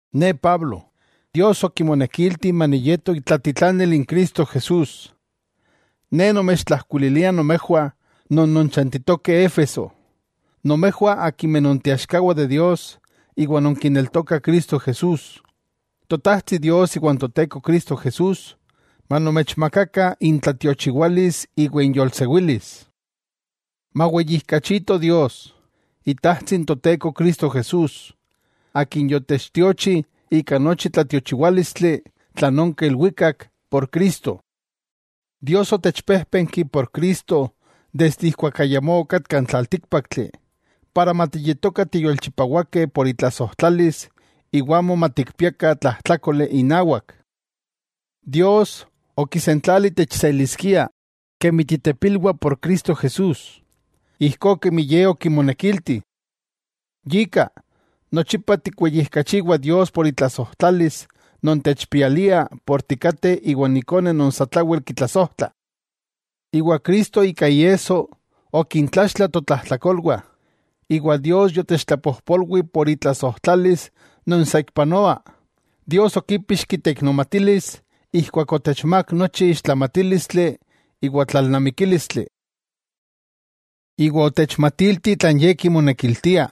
Ne Pablo, akin Dios okimonekilti maniyeto itlatitlanil n Cristo Jesús. Ne nomechtlajkuililia nomejwah non nonchantitokeh Éfeso, nomejwah akimeh nonteaxkawah de Dios iwa nonkineltokah Cristo Jesús. Totajtsi Dios iwan Toteko Cristo Jesús, manomechmakakah intlatiochiwalis iwa inyolsewilis. Maweyijkachito Dios, Itajtsi n Toteko Cristo Jesús, Akin yotechtiochi ika nochi tlatiochiwálistli tlan onka ilwikak por Cristo. Dios otechpéjpenki por Cristo desde ijkuak ayamó okatka n tlaltíkpaktli, para matiyetokah tiyolchipawakeh por itlasojtlalis iwa amo matikpiakah tlajtlákoli inawak. Dios, okisentlali techseliskia kemi titepilwah por Cristo Jesús, ijkó kemi Ye okimonekilti. Yika, nochipa tikweyijkachiwah Dios por itlasojtlalis non techpialia por tikateh iwan Ikone non satlawel kitlasojtla. Iwa Cristo ika iesso okintlaxtla totlajtlakolwah, iwa Dios yotechtlapojpolwi por itlasojtlalis non saikpanoa. Dios okipixki teiknomatilis ijkuak otechmák nochi ixtlamatílistli iwa tlalnamikílistli. Iwa otechmatilti tlan Ye kimonekiltia,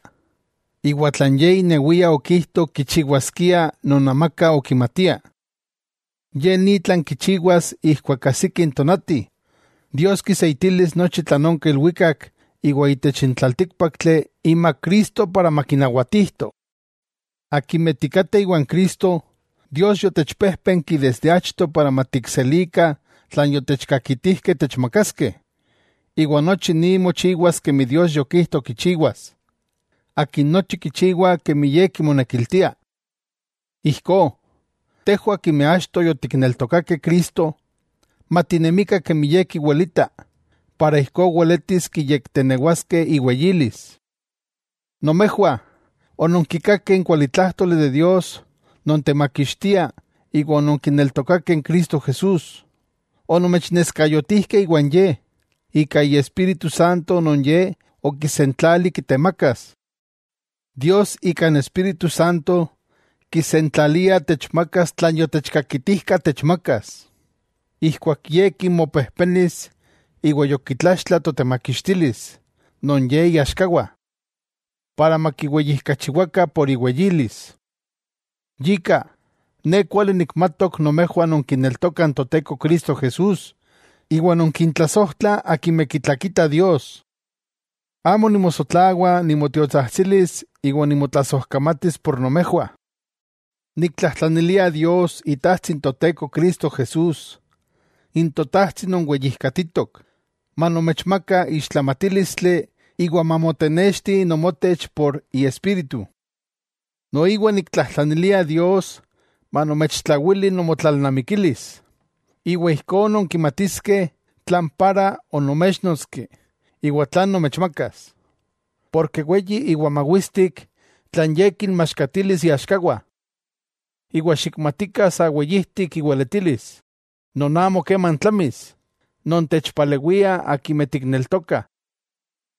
iwa tlan Ye inewia okijto kichiwaskia non amaka okimatia. Ye ni tlan kichiwas ijkuak ajsiki n tonati, Dios kiseitilis nochi tlan onka ilwikak iwa itech n tlaltíkpaktli imak Cristo para makinawatijto. Akimeh tikateh iwan Cristo, Dios yotechpéjpenki desde achto para matikselikah tlan yotechkakitijkeh techmakaskeh. Iwa nochi ni mochiwas kemi Dios yokijto kichiwas, Akin nochi kichiwa kemi Ye kimonekiltia. Ijkó, tejwah akimeh achto yotikneltokakeh Cristo, matinemikah kemi Ye kiwelita para ijkó weletis kiyektenewaskeh iweyilis. Nomejwah, ononkikakeh n kualitlájtoli de Dios non temakixtia iwa ononkineltokakeh n Cristo Jesús. Onomechneskayotijkeh iwan Ye, ika Iespíritu Santo non Ye okisentlali kitemakas. Dios ika n Espíritu Santo kisentlalia techmakas tlan yotechkakitijka techmakas. Ijkuak Ye kinmopejpenis iwa yokitlaxtla totemakixtilis non Ye iaxkawah. Para makiweyijkachiwakah por iweyilis. Yika, ne kuali nikmatok nomejwah nonkineltokah n Toteko Jesús iwa nonkintlasojtlah akimeh kitlakitah Dios, amo nimosotlawa nimotiotsajtsilis iwa nimotlasojkamatis por nomejwah. Niktlajtlanilia Dios Itajtsi n Toteko Cristo Jesús, n Totajtsi non weyikajtitok, manomechmaka ixtlamatílistli iwa mamotenexti nomotech por iespíritu. Noiwa niktlajtlanilia Dios manomechtlawili nomotlalnamikilis, iwa ijkó nonkimatiskeh tlan para onomechnotski iwa tlan nomechmakas. Porke weyi iwa mawistik tlan Ye kinmaxkatilis iaxkawah. Iwa xikmatika sa weyijtik iweletilis, non amo keman tlamis, non techpalewia akimeh tikneltokah.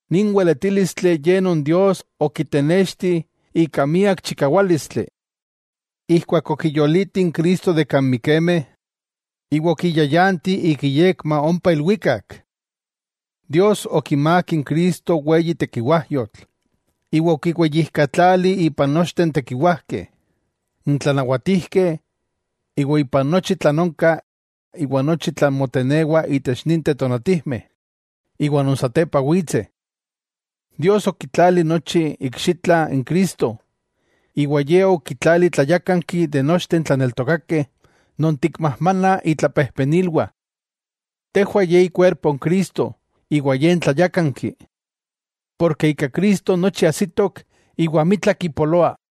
Nin weletílistli ye non Dios okitenexti ika miak chikawálistli, ijkuak okiyoliti n Cristo de kan mikemeh iwa okiyayanti ik iyekma ompa ilwikak. Dios okimák n Cristo weyi tekiwájyotl, iwa okiweyijkatlali ipan nochteh n tekiwajkeh, n tlanawatijkeh, iwa ipan nochi tlan onka iwa nochi tlan motenewa itech ninteh tonatijmeh, iwa non satepa witseh. Dios okitlali nochi iikxitla n Cristo, iwa Ye okitlali tlayákanki de nochteh n tlaneltokakeh non tikmajmana itlapejpenilwah. Tejwah ye ikuerpo n Cristo iwa Ye n tlayákanki. Porke ika Cristo nochi ajsitok iwa amitla kipoloa.